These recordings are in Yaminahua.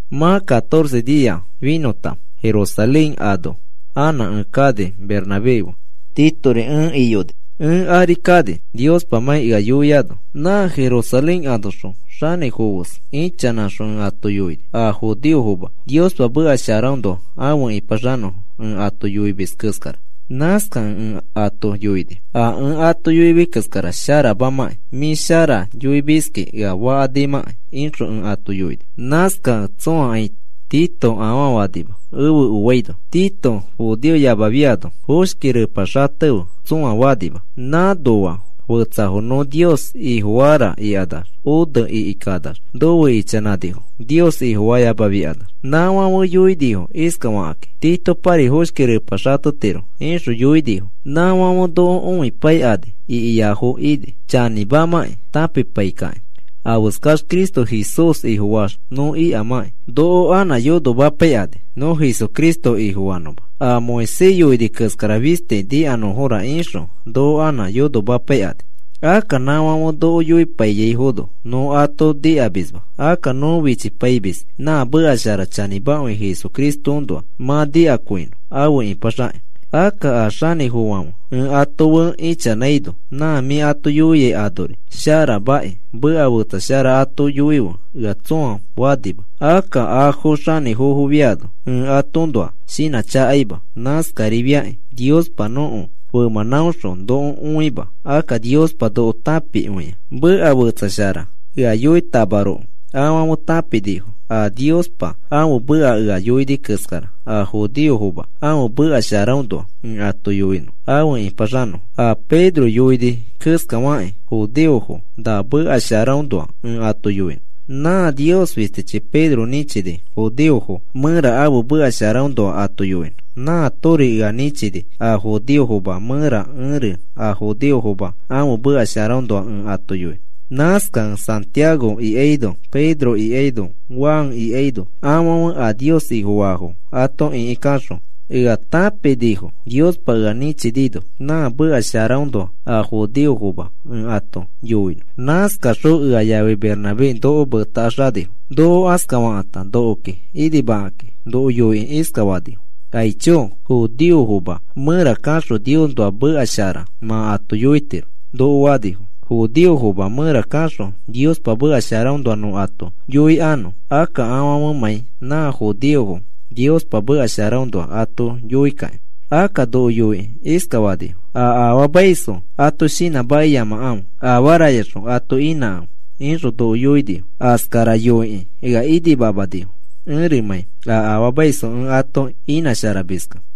Mã catorce xinia finõta Jerusalén ano anã ẽ kani Bernabé fe. Titori ẽ iyoni. Ẽ ari kani Niospamãi ea yoiano. Nã Jerusalén anoxõ xanĩfofo fes ichanãxõ ẽ ato yoini a judeofoma Niospa meka sharaõnoa afe ipaxanõfo ẽ ato yoimis keskara. Nãskakẽ ẽ ato yoini: “A ẽ ato yoimis keskara sharamamãkĩ, mĩ shara yoimiski ea fakanimãkai,” ixõ ẽ ato yoini. Nãskakẽ tsõakai Tito afaa fanima efe oiano. Tito judeoyamafiano foshki repa xatefe tsõa fanima. Nãnoa fetsafo nõ Nios Ifofara ikanax one ikikanax nofe ichanãnifo, Nios Ifofayamafiakanax. Nãfãfe yoinifo iskafaki: “Titopari foshki repa xatetiro,” ixõ yoinifo. Nãfãfe noko õipaikani ikiafo ini, chanĩmamãkĩ tãpipaikakĩ afeskax Cristo Jesús Ifofaax nõ ikamãki. Noko anã yonomapaikani nõ Jesucristo Ifofanõma a Moisés yoini keskara fisti nikanõfora ixõ noko anã yonomapaikani. Akka nãfãfe noko yoipaiyaifono nõ ato nikamisma. Akka nõ fichipaimis nã meka shara chanĩmakõi Jesucristoõnoa mã nikakõinõ afe ipaxaki. Akka a xanĩfofofãfe ẽ ato fe ichanãino, “Nã mĩ ato yoiai anori sharamaki, meka fetsa shara ato yoife,” ea tsõa fanima. Akka afo xanĩfofofiano ẽ atoõnoa shinãchakaima. Nãskarifiakĩ Niospa nõko femãnãõxõ noko onãima, akka Niospa noko tãpikõia. Meka fetsa shara ea yoitamaroko, afãfe tãpinifo a Niospa ãfe meka ea yoini keskara a judeofoma ãfe meka sharaõnoa ẽ ato yoinõ afe ipaxanõfo. A Pedro yoini keskafakĩ judeofo na meka sharaõnoa ẽ ato yoinõ. Nã Nios fistichi Pedro nĩchini judeofo mẽra ãfe meka sharaõnoa ato yoinõ. Nãatori ea nĩchini a judeofoma mẽra ẽri a judeofoma ãfe meka sharaõnoa ẽ ato yoinõ. Nãskakẽ Santiago ikaino Pedro ikaino Juan ikaino, afãfe a Nios Ifofaafo ato ĩkikaxõ ea tãpinifo Niospa ea nĩchinino nã meka sharaõnoa a judeofoma ẽ ato yoinõ. Nãskakaxõ ea yafi Bernabé noko metakaxanifo. Noko askafakãta nokoki inimakaki noko yoikĩ iskafanifo: “Aicho, judeofoma mẽra kaxõ Niosnoa meka shara mã ato yoitiro,” noko fanifo, judeofoma mẽra kaxõ Niospa meka sharaõnoa nõ ato yoikanõ, akka afãfemãi nã judeofo Niospa meka sharaõnoa ato yoikakĩ. Akka noko yoikĩ iskafanifo: “A afaamaisfo ato shinãmakiyamakãfe. Afarayaxõ ato inãkãfe,” ixõ noko yoinifo. Askara yoikĩ ea inimamanifo ẽrimãi a afaamaisfo ẽ ato inãsharamiskẽ.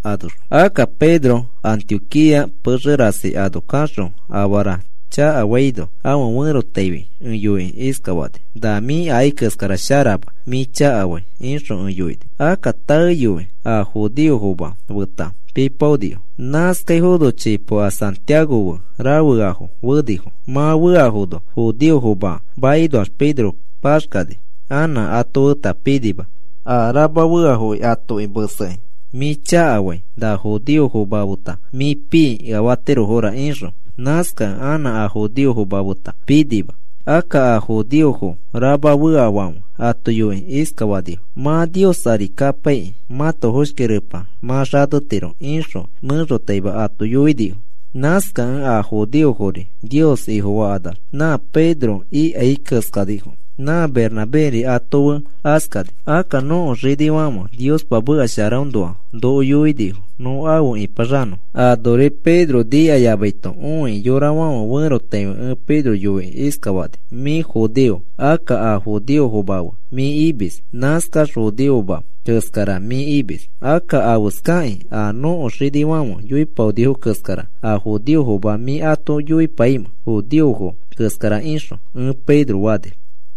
Akka Pedro Antioquía pexe rasi ano kaxõ afara chakafaino ãfe ferotaifi ẽ yoikĩ iskafani: “Na mĩ akai keskara sharama, mĩ chakafai,” ixõ ẽ yoini. Akka taeyoi a judeofoma feta pipaonifo. Nãskaifono chipo a Santiago fe rafeafo fenifo. Mã feafono judeofoma makinoax Pedro paxkani anã ato feta pinima a rama feafoki atoki mesekĩ mĩ chakafai na judeofoma feta mĩ pii ea fatirofora ixõ. Nãskakẽ anã a judeofoma feta pinima. Akka a judeofo rama feafãfe ato yoikĩ iskafanifo: “Mã Nios ari kapaikĩ mãto foshki repa mã xatetiro,” ixõ mẽxotaima ato yoinifo. Nãskakẽ a judeofori Nios Ifofakanax nã Pedro ikai keskanifo. Nã Bernabéri ato fe askani. Akka nõko xinifãfe Niospa meka sharaõnoa noko yoinifo nõ afe ipaxanõ anori Pedro nikayamaito õikĩ yorafãfe ferotaifi ẽ Pedro yoikĩ iskafani: “Mĩ judeo. Akka a judeofoma fe mĩ imis, nãskax judeoma keskara mĩ imis. Akka, ¿afeskakĩ a nõko xinifãfe yoipaonifo keskara a judeofoma mĩ ato yoipaimẽ, judeofo keskara ixõ?” ẽ Pedro fani.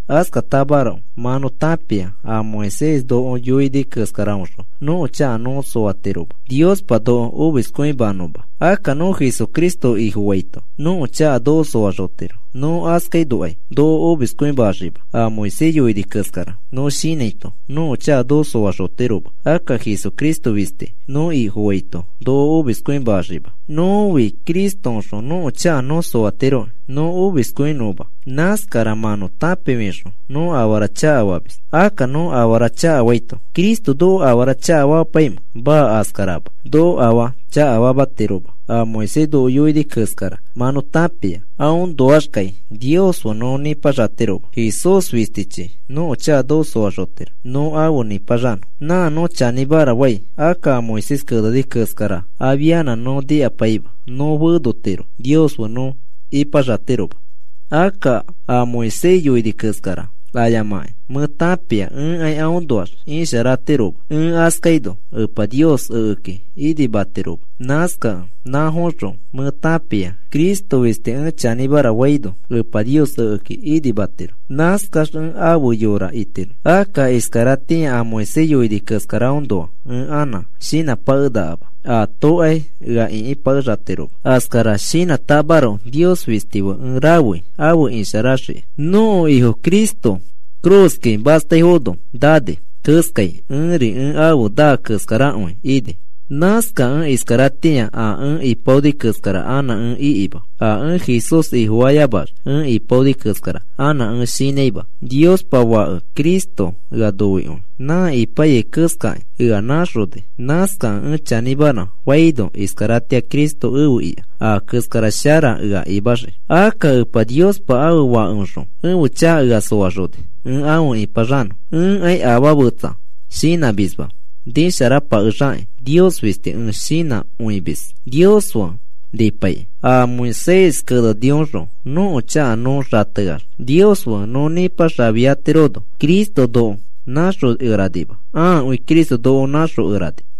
Askatamaroko mã nõ tãpia a Moisés noko yoini keskaraõxõ nõko chaka nõ soatiroma Niospa noko omiskõimanõma. Akka nõ Jesucristo Ifofaito nõko chaka noko soaxotiro, nõ askainokai noko omiskõimaxima. A Moisés yoini keskara nõ shinãito nõko chaka noko soaxotiroma. Akka Jesucristo fisti nõ Ifofaito noko omiskõimaxima. Nõfi Cristoõxõ nõko chaka nõ soatiroki noko omiskõimanõma. Nãskara mã nõ tãpifixõ nõ afara chakafamis. Akka nõ afara chakafaito, ¿Cristo noko afara chakafamapaimẽ? Maa, askarama. Noko afaa chakafamatiroma. A Moisés noko yoini keskara mã nõ tãpia, aõnoaxkai Nios fe nõ nipaxatiroma. Jesús fistichi nõko chaka noko soaxotiro nõ afe nipaxanõ. Nã nõ chanĩmara fai. Akka a Moisés keneni keskara afianã nõ nikapai nõ fenotiro Nios fe nõ ipaxatiroma. Akka a Moisés yoini keskara ayamakĩ mẽ tãpia ẽkai aõnoax isharatiroma. Ẽ askaino Epa Nios ekeki inimatiroma. Nãskakẽ nãfoõxõ mẽ tãpia Cristo fisti ẽ chanĩmara faino Epa Nios ekeki inimatiro. Nãskax ẽ afe yora itiro. Akka iskaratĩa a Moisés yoini keskaraõnoa anã ẽ shinãpakenakama, atokai ea ĩkipakexatiroma. Askara shinãtamaroko Nios fisti fe ẽ rafei afe isharaxiki. Nõko Ifo Cristo ifi cruz ikaki mastaifono nani keskai ẽri ẽ afe naa keskarakõi ini. Nãskakẽ iskaratĩa a ẽ ipaoni keskara anã ẽ ikima. A ẽ Jesús Ifofayamax ẽ ipaoni keskara anã ẽ shinãima. Niospa Fake Cristo ea noikõi nã ipaiyai keskakĩ ea nãxoni. Nãskakẽ ẽ chanĩmara faino iskaratĩa Cristo efe ika a keskara shara ea imaxiki. Akka Epa Niospa ãfe Fakeõxõ ẽfe chaka ea soaxoni ẽ afe nipaxanõ. Ẽkai afaa fetsa shinãmisma nisharapakexakĩ, Nios fisti ẽ shinãkõimis Nios fe nipaikĩ. A Moisés kenenioxõ nõko chaka nõ xateax Nios fe nõ nipaxafiatirono Cristo noko nãxokeranima. Ãakõi Cristo noko nãxokerani.